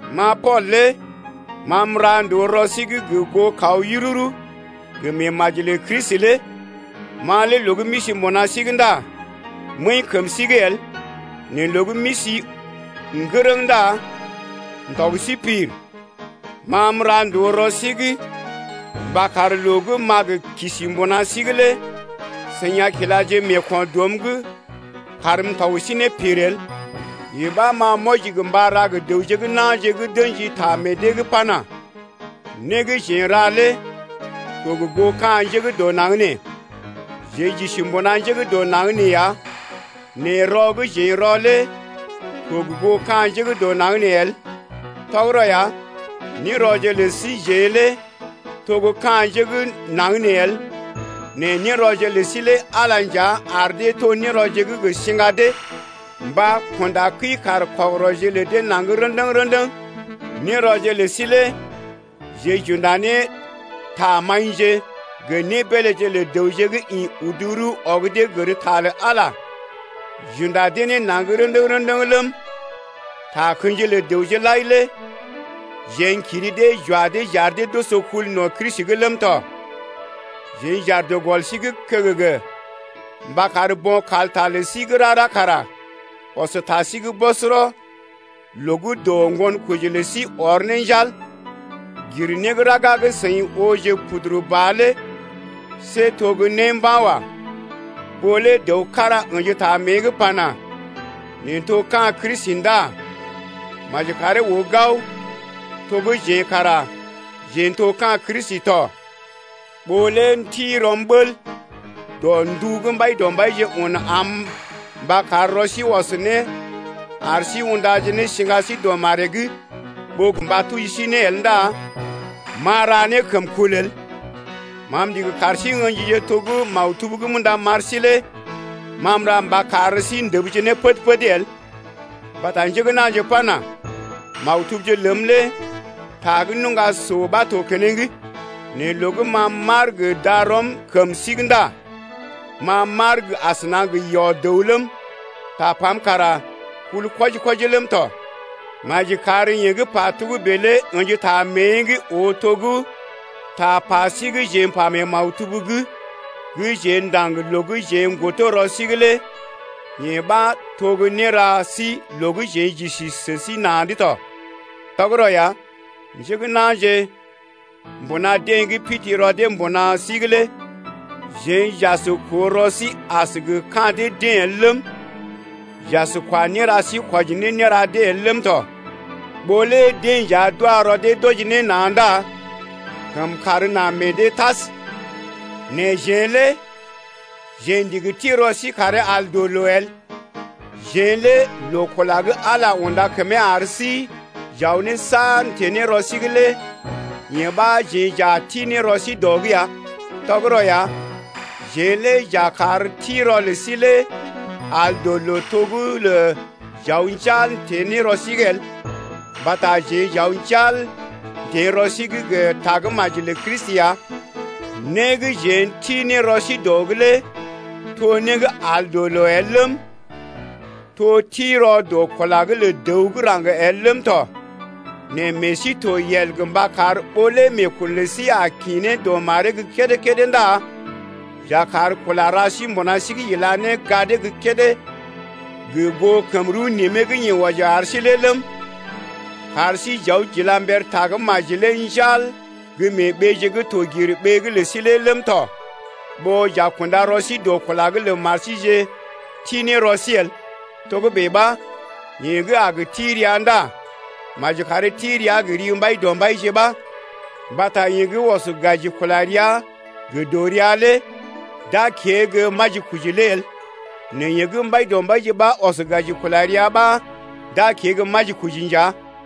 Ma Pool lé ma m’ra ndòo rɔ sí’g gə goo kaw yururu gə meemaji lə Kristi lé, ma lé loo gə́ m’isi mbuna sí’g ndá m’əḭ kəm sí’g el nɛ loo gə́ m’isi ŋgərəŋ ndá m’tɔg sí pir. Ma m’ra ndòo rɔ sí’g mba kar loo gə́ m’a gə kisi mbuna sí’g lé seḭ a kilaje meeko̰ dɔm’g karm m’tɔg sí ne pir el. Yee ɓa, ma m’wɔji gə mba ra gə dəwje gə́ na̰je gə́ d’ə̰ji ta meḛ dee’g pana: Né gə́ jeḛ n’ra lé to gə goo ka̰ njé gə́ dɔ naŋg nee. Jeḛ j’isi mbuna njé gə́ dɔ naŋg nee ya nɛ rɔ gə́ jeḛ n’rɔ lé to gə goo ka̰ njé gə́ dɔ naŋg nee el. Tɔgərɔ ya, nérɔje lə síjeḛ lé to gə́ ka̰ njé gə́ naŋg nee el nɛ nérɔje lə sí lé Ala nja ar dee to nérɔje gə́ gə siŋga dee mba kunda kəi-kaar-kɔgərɔje lə dee naŋg rə̰dəŋ-rə̰dəŋ. Nérɔje lə sí lé jeḛ j’unda ne tamaḭje gə nébeeléje lə dəwje gə́ ḭ udu rəw ɔg dee gər ta lə Ala j’unda dee ne naŋg rə̰dəŋ-rə̰dəŋ ləm, takə̰ji lə dəwje lai lé jeḛ n’kiri dee j’wa dee j’ar dee d’oso kul no̰ Kristi’g ləm tɔ. Jeḛ j’aar dɔ gɔl sí’g kəgəgə mba kar bo̰ kalta lə sí gə́ rara kara ɔs ta sí’g bɔsɔrɔ loo gə́ dɔ ŋgonkoji lə sí ɔr ne njal lé. Gir né gə́ raga gə́ seḭ ooje puduru ba lé see to né mba̰ wa. Ɓó lé dəw kára ə̰ji ta mée’g pana: Neḛ n’to ka̰ Kristi ndá maji karee oo gao to gə́ jeḛ kara jeḛ n’to ka̰ Kristi tɔ. Ɓó lé m’ti rɔm bəl dɔ ndu gə́ Mbaidɔmbaije un am mba kar rɔ sí ɔs ne ar sí undaje ne siŋga sí dɔ maree’g ɓó mba tuji sí ne el ndá m’a ra né kəmkul el. Ma m’ndigi kar sí ə̰jije to gə́ maktub gə́ m’unda m’ar sí lé ma m’ra mba kar sí ndəbje ne pəd-pəd el. Mbata njé gə́ na̰je pana: Maktubje ləm lé ta gə́ nuŋga so ɓa to keneŋ, nɛ loo gə́ ma m’aar gə darɔm kəm sí’g ndá ma m’aar asəna gə yɔ-dəw ləm, tapam kara kul kwɔji-kwɔji ləm tɔ. Maji kar yeḛ gə́ pa togə́bè lé ə̰ji ta mée’g oo to gə́ tapa sí gə́ jeḛ m’pa mee maktub’g gə́ jeḛ ndaŋg loo gə́ jeḛ n’godo rɔ sí’g lé yee ɓa to gə́ néra sí loo gə́ jeḛ j’isi sə sí na̰’d tɔ. Tɔgərɔ ya, njé gə́ na̰je mbuna deḛ gə́ pidi rɔ dee mbuna sí’g lé jeḛ j’as koo rɔ sí as gə ka̰ dee-deḛ el ləm, j’as kwa néra sí kwɔji ne néra dee el ləm tɔ. Ɓó lé deḛ nja d’wa rɔ dee d’wɔji ne na̰ ndá kəmkàr na meḛ dee tas. Nɛ jeḛ lé jeḛ ndigi ti rɔ sí karee al dɔ loo el. Jeḛ lé loo kula gə́ Ala unda kəmee ar sí j’aw ne saar n’teḛ ne rɔ sí’g lé yee ɓa, jeḛ j’a ti ne rɔ sí dɔ’g ya. Tɔgərɔ ya, jeḛ lé j’a kar ti rɔ lə sí lé al dɔ loo to gə́ lə j’aw njal n’teḛ rɔ sí’g el, mbata jeḛ j’aw njal n’teḛ rɔ sí’g gə Tagə́maji lə Kristi ya. Né gə́ jeḛ n’ti ne rɔ sí dɔ’g lé to né gə́ al dɔ loo el ləm, to ti rɔ dɔ kula’g lə dəw gə́ raŋg el ləm tɔ. Nɛ meḛ sí yel tɔ mba kar ɓó lé meekun lə sí a kḭ ne dɔ maree’g gə́ kédé-kédé ndá j’a kar kula ra sí mbuna sí’g ila ne gadee gə́ kédé gə goo kəm rəw nimee gə́ yeḛ wɔji ar sí lé ləm, kar sí j’aw j’ila mber Tagə́maji lé njal gə́ mee ɓeeje gə́ to gir ɓee’g lə sí lé ləm tɔ, ɓó j’a kunda rɔ sí dɔ kula’g lə mar síje ti ne rɔ sí el. Togə́bè ɓa yeḛ gə́ a gə ti rəa ndá maji karee ti rəa gə ri Mbaidɔmbaije ɓa. Mbata yeḛ gə́ ɔs gaji kula rəa gə dɔrea lé d’a kée gə́ majikoji lé el, nɛ yeḛ gə́ Mbaidɔmbaije ɓa ɔs gaji kula rəa ɓa d’a kée gə́ majikoji ya.